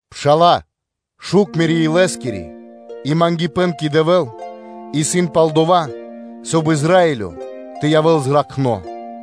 Пшала́лэ! Шук мирэ́ илэскири и мангипэ́н кэ Дэвэ́л исын пал дова́, соб (кай) Израилё тэ явэ́л зракхно.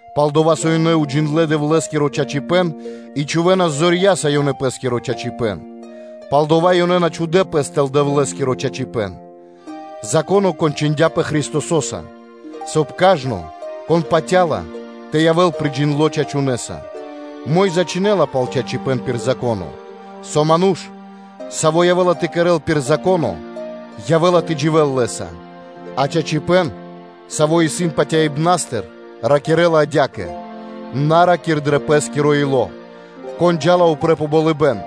Пал-дова́ со ёнэ на уджиндлэ́ Дэвлэ́скиро чачипэ́н, и чхувэ́нас зорья́са ёнэ пэ́скиро чачипэ́н, пал-дова́ ёнэ на чхудэ́ пэс тэл Дэвлэ́скиро чачипэ́н. Зако́но кончындяпэ Христосо́са, соб (кай) кажно, кон патя́ла, тэ явэ́л приджиндло чачунэса. Мо́йза (Моисеё) чхинэла пал чачипэ́н пир Зако́но: “Со ману́ш, саво́ явэ́ла тэ кэрэ́л пир Зако́но, явэ́ла тэ дживэ́л Лэ́са.” А чачипэ́н, саво́ исын патяибнастыр, ракирэ́ла адя́кэ: “На ра́кир дро пэ́скиро ило́: ‘Кон джа́ла упрэ́ пэ болыбэ́н?’”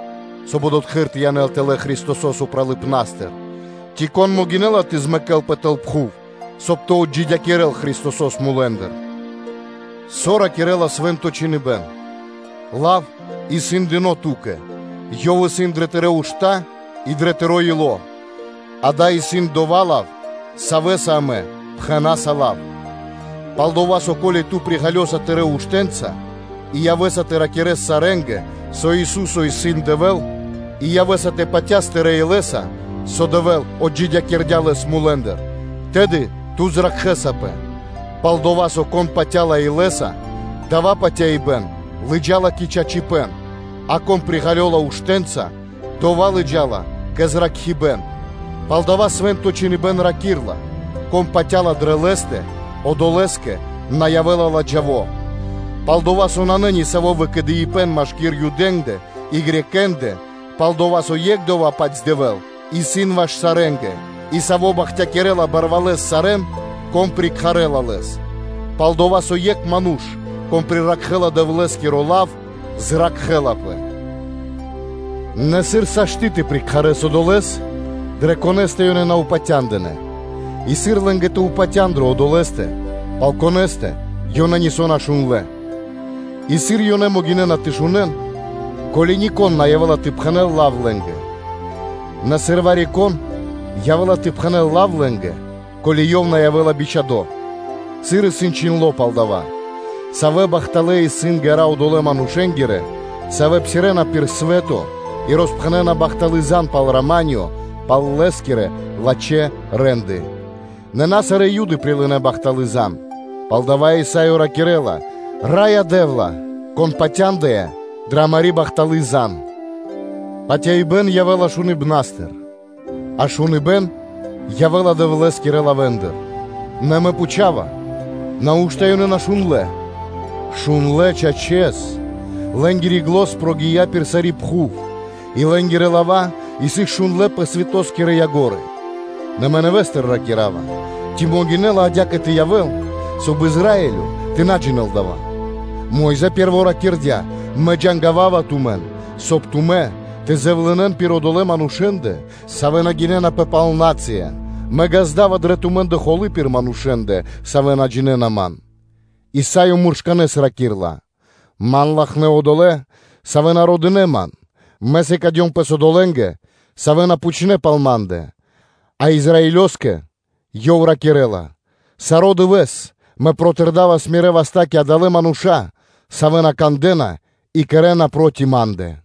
(Соб (кай) одотхы́р тэ янэл тэлэ́ Христосо́с упралыпнастыр) ци ‘Кон могинэ́ла тэ змэкэлпэ тэл пхув?’ (Соб (кай) тэ ґаздэл Христосо́с мулэ́ндыр). Со ракирэ́ла Свэ́нто Чхиныбэ́н? “Лав исын дыно́ ту́кэ, ёв исын дрэ тырэ́ ушта́ и дрэ тыро́ ило́”, ґа́да, исын дова́ лав, савэ́са амэ пхэна́са лав, пал-дова́ со, ко́ли ту приґалёса тырэ́ уштэ́нца и явэ́са тэ ракирэ́с сарэ́нгэ, со ‘Ису́со исын Дэвэ́л’ и явэ́са тэ патяс тырэ́ илэ́са, со Дэвэ́л отджидякирдя́ Лэс мулэ́ндыр, тэды ту зракхэсапэ. Пал-дова́ со, кон патя́ла илэ́са, дава́ патяибэ́н лыджа́ла кэ чачипэ́н, а кон приґалёла уштэ́нца, дава́ лыджа́ла кэ зракхибэ́н. Палдава́ Свэ́нто Чхиныбэ́н ракирэ́ла: “Кон патя́ла дрэ Лэ́стэ, одолэ́скэ на явэ́ла ладжаво.” Пал-дова́ со нанэ нисаво́ выкэдыибэн машки́р Юдэ́ндэ и Элинэ́нгэ (Грекэ́нгэ/Баламэ́нгэ); пал-дова́ со екх Одова́-паць Дэвэ́л исын ваш сарэ́нгэ, и Саво́ бахтякирэ́ла барвалэс сарэ́н, кон прикхарэла Лэс. Пал-дова́ со со екх ману́ш, кон прикхарэла Дэвлэ́скиро лав, зракхэ́лапэ. Нэ сыр сашты́ тэ прикхарэс Одолэ́с, дрэ Конэ́стэ ёнэ на упатя́ндынэ? И сыр лэ́нгэ тэ упатян дрэ Одолэ́стэ, пал Конэ́стэ ёнэ нисо́ на шундлэ́? И сыр ёнэ могинэ́на тэ шунэ́н, ко́ли нико́н на явэ́ла тэ пхэнэ́л лав лэ́нгэ? Нэ сыр вари-кон явэ́ла тэ пхэнэ́л лав лэ́нгэ, ко́ли ёв на явэ́ла бичхадо́? Сыр исын чхиндло́ пал дава́: “Савэ бахталэ́ исын ґэра́ одолэ́ манушэ́нгирэ, савэ́ псирэ́на пир свэ́то и роспхэнэна бахталы́ зан пал рама́нё, пал Лэ́скирэ лачхэ́ рэ́нды.” Нэ на сарэ́ Юды прилынэ́ бахталы́ зан (звесь). Палдава́ Исаё ракирэ́ла: “Раё Дэ́вла! Кон патяндыя дрэ амари́ бахталы́ зан (звесь).” Патяибэ́н явэ́ла шуныбнастыр, а шуныбэ́н явэ́ла Дэвлэ́скирэ лавэ́ндыр. Нэ мэ пхучава: “Нау́што (неужэли) ёнэ на шундлэ́? Шундлэ́, чачэс; лэ́нгири зан прогия́ пир сари́ пхув, и лэ́нгирэ лава́ сыс шундлэ́ пэ свэто́скирэ яго́ры (кра́и).” Нэ мэ нэвэ́стыр ракира́ва: “Ци могинэ́ла адя́кэ тэ явэ́л, соб (кай) Израилё тэ на джинэ́л дава́? Мо́йза пэ́рво ракирдя́: ‘Мэ джангавава тумэн, соб (кай) тумэ́ тэ зэвлынэн пир одолэ́ манушэ́ндэ, савэ́ на гинэнапэ пал нацыя: мэ ґазда́ва дрэ тумэ́ндэ холы́ пир манушэ́ндэ, савэ́ на джинэ́на Ман.’” Исаё муршканэ́с ракирэ́ла: “Ман латхнэ́ одолэ́, савэ́ на родынэ Ман; Мэ сыкадём пэс одолэ́нгэ, савэ́ на пхучнэ́ пал Ма́ндэ.” А Израилёскэ Ёв ракирэ́ла: “Саро́ дывэ́с Мэ протырдавас мирэ́ васта́ кэ адалэ́ мануша́, савэ́ на кандэ́на и кэрэ́на проти Ма́ндэ.”